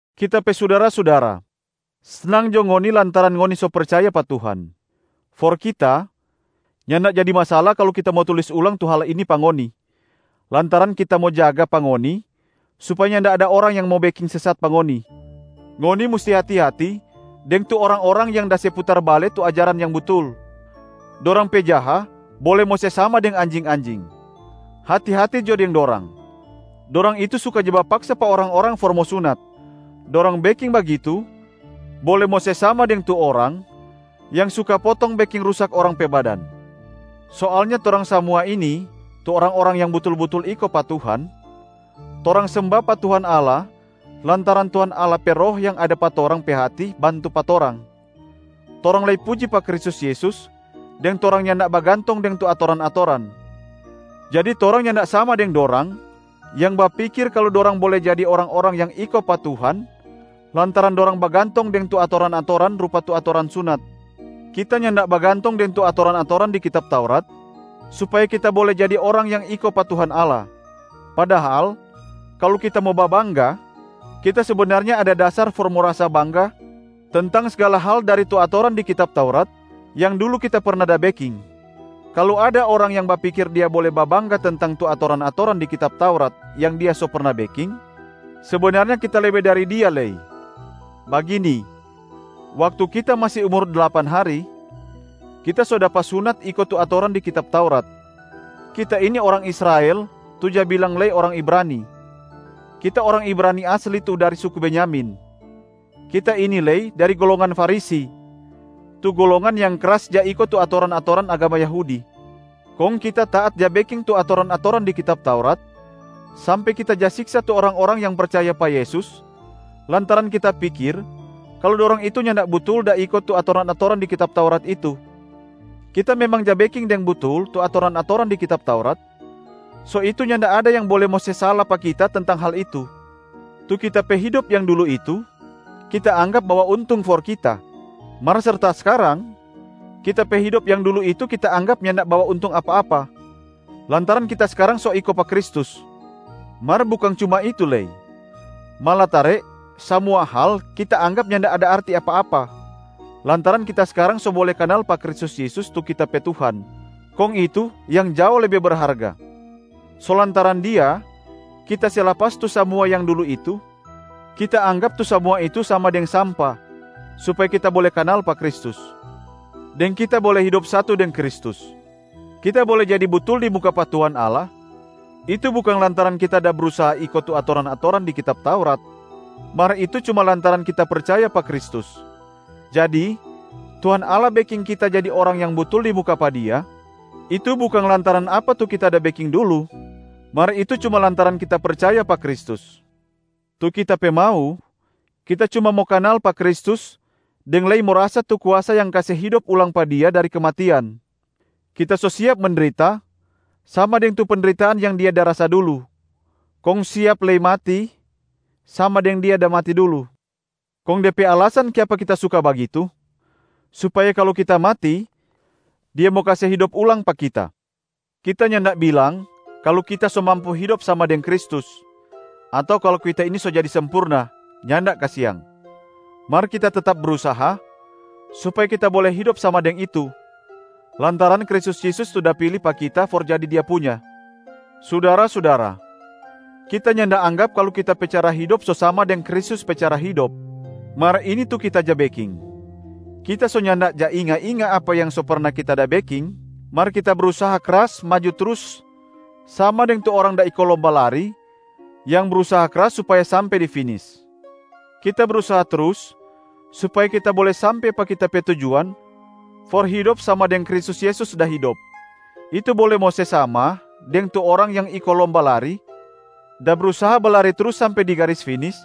Kita pe sudara-sudara, snang jo ngoni lantaran ngoni so percaya pa Tuhan. For kita, nyanda jadi masala kalu kita mo tulis ulang tu hal ini pa ngoni, lantaran kita mo jaga pa ngoni supaya nyanda ada orang yang mo beking sesat pa ngoni. Ngoni musti hati-hati deng tu orang-orang yang da se putar bale tu ajaran yang butul, dorang pe jaha bole mo se sama deng anjing-anjing. Hati-hati jo deng dorang, dorang itu suka ja bapaksa pa orang-orang for mo sunat. Dorang beking bagitu bole mo se sama deng tu orang yang suka potong beking rusak orang pe badan. Soalnya torang samua ini tu orang-orang yang butul-butul iko pa Tuhan, torang semba pa Tuhan Allah lantaran Tuhan Allah pe Roh yang ada pa torang pe hati bantu pa torang. Torang lei puji pa Kristus Yesus deng torang nyanda bagantong deng tu atoran-atoran. Jadi torang nyanda sama deng dorang yang bapikir kalu dorang bole jadi orang-orang yang iko pa Tuhan lantaran dorang bagantong deng tu atoran-atoran rupa tu atoran sunat. Kita nyanda bagantong deng tu atoran-atoran di Kitab Taurat supaya kita bole jadi orang yang iko pa Tuhan Allah, padahal kalu kita mo babangga, kita sebenarnya ada dasar for mo rasa bangga tentang sgala hal dari tu atoran di kitab Taurat yang dulu kita perna da beking. Kalu ada orang yang bapikir dia bole babangga tentang tu atoran-atoran di kitab Taurat yang dia so perna beking, sebenarnya kita lebe dari dia lei. Bagini, waktu kita masi umur dlapan hari, kita so dapa sunat iko tu atoran di kitab Taurat. Kita ini orang Israel tu ja bilang lei orang Ibrani, kita orang Ibrani asli tu dari suku Benyamin. Kita ini lei dari golongan Farisi, tu golongan yang kras ja iko tu atoran-atoran agama Yahudi. Kong kita taat ja beking tu atoran-atoran di kitab Taurat, sampe kita ja siksa tu orang-orang yang percaya pa Yesus lantaran kita pikir kalu dorang itu nyanda butul da iko tu atoran-atoran di kitab Taurat itu. Kita memang ja beking deng butul tu atoran-atoran di kitab Taurat, so itu nyanda ada yang bole mo se sala pa kita tentang hal itu. Tu kita pe hidop yang dulu itu, kita anggap bawa untung for kita. Mar serta skarang, kita pe hidop yang dulu itu kita anggap nyanda bawa untung apa-apa, lantaran kita skarang so iko pa Kristus. Mar bukang cuma itu lei, malatare samua hal kita anggap nyanda ada arti apa-apa lantaran kita skarang so bole kanal pa Kristus Yesus tu kita pe Tuhan, kong itu yang jao lebe berharga. So lantaran Dia, kita se lapas tu samua yang dulu itu, kita anggap tu samua itu sama deng sampa, supaya kita bole kanal pa Kristus, deng kita bole hidop satu deng Kristus. Kita bole jadi butul di muka pa Tuhan Allah, itu bukang lantaran kita da brusaha iko tu atoran-atoran di kitab Taurat, mar itu cuma lantaran kita percaya pa Kristus. Jadi Tuhan Allah beking kita jadi orang yang butul di muka pa Dia, itu bukang lantaran apa tu kita da beking dulu, mar itu cuma lantaran kita percaya pa Kristus. Tu kita pe mau, kita cuma mo kanal pa Kristus deng lei mo rasa tu kuasa yang kase hidop ulang pa Dia dari kematian. Kita so siap mendrita sama deng tu pendritaan yang Dia da rasa dulu, kong siap lei mati sama deng Dia da mati dulu. Kong de pe alasan kiapa kita suka bagitu supaya kalu kita mati Dia mo kase hidop ulang pa kita. Kita nyanda bilang kalu kita so mampu hidop sama deng Kristus ato kalu kita ini so jadi sempurna, nyanda kasiang. Mar kita tetap brusaha supaya kita bole hidop sama deng itu, lantaran Kristus Yesus tu da pili pa kita for jadi Dia punya. Sudara-sudara, kita nyanda anggap kalu kita pe cara hidop so sama deng Kristus pe cara hidop, mar ini tu kita ja beking: kita so nyanda ja inga-inga apa yang so perna kita da beking, mar kita brusaha kras maju trus sama deng tu orang da iko lomba lari yang brusaha kras supaya sampe di finis. Kita brusaha trus supaya kita bole sampe pa kita pe tujuan for hidop sama deng Kristus Yesus da hidop, itu bole mo se sama deng tu orang yang iko lomba lari da brusaha balari trus sampe di garis finis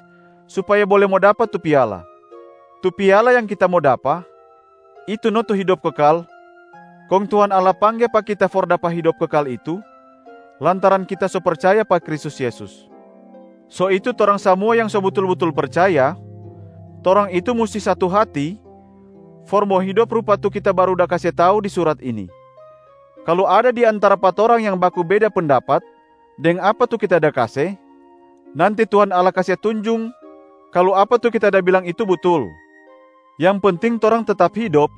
supaya bole mo dapa tu piala. Tu piala yang kita mo dapa, itu no tu hidop kekal, kong Tuhan Allah pangge pa kita for dapa tu hidop kekal itu lantaran kita so percaya pa Kristus Yesus. So itu torang samua yang so butul-butul percaya, torang itu musti satu hati for mo hidop rupa tu kita baru da kase tau di surat ini. Kalu ada di antara pa torang yang baku beda pendapat deng apa tu kita da kase, nanti Tuhan Allah kase tunjung kalu apa tu kita da bilang itu butul. Yang penting torang tetap hidop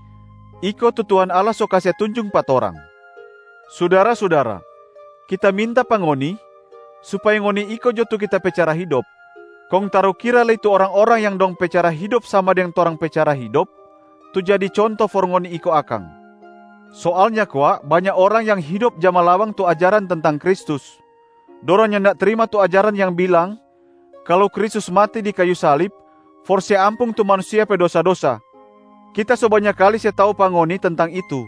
iko tu Tuhan Allah so kase tunjung pa torang. Sudara-sudara, kita minta pa ngoni supaya ngoni iko jo tu kita pe cara hidop, kong tarukira lei tu orang-orang yang dong pe cara hidop sama deng torang pe cara hidop tu jadi conto for ngoni iko akang. Soalnya kwa banya orang yang hidop ja malawang tu ajaran tentang Kristus, dorang nyanda trima tu ajaran yang bilang kalu Kristus mati di kayu salib for se ampung tu manusia pe dosa-dosa. Kita so banya kali se tau pa ngoni tentang itu,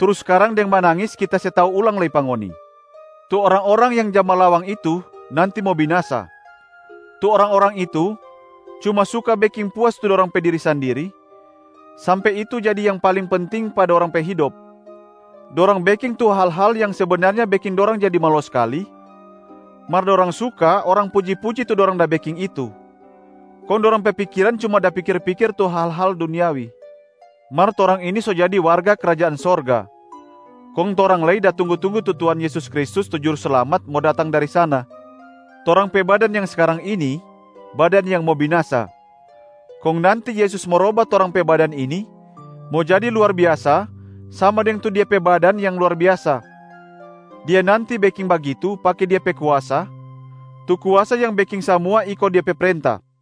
trus skarang deng manangis kita se tau ulang lei pa ngoni. Tu orang-orang yang ja malawang itu nanti mo binasa. Tu orang-orang itu cuma suka beking puas tu dorang pe diri sandiri, sampe itu jadi yang paling penting pa dorang pe hidop. Dorang beking tu hal-hal yang sebenarnya beking dorang jadi malo skali mar dorang suka orang puji-puji tu dorang da beking itu, kong dorang pe pikiran cuma da pikir-pikir tu hal-hal duniawi. Mar torang ini so jadi warga krajaan sorga, kong torang lei da tunggu-tunggu tu Tuhan Yesus Kristus tu Juruslamat mo datang dari sana. Torang pe badan yang skarang ini, badan yang mo binasa. Kong nanti Yesus mo roba torang pe badan ini mo jadi luar biasa sama deng tu Dia pe badan yang luar biasa. Dia nanti beking bagitu pake Dia pe kuasa, tu kuasa yang beking samua iko Dia pe prenta.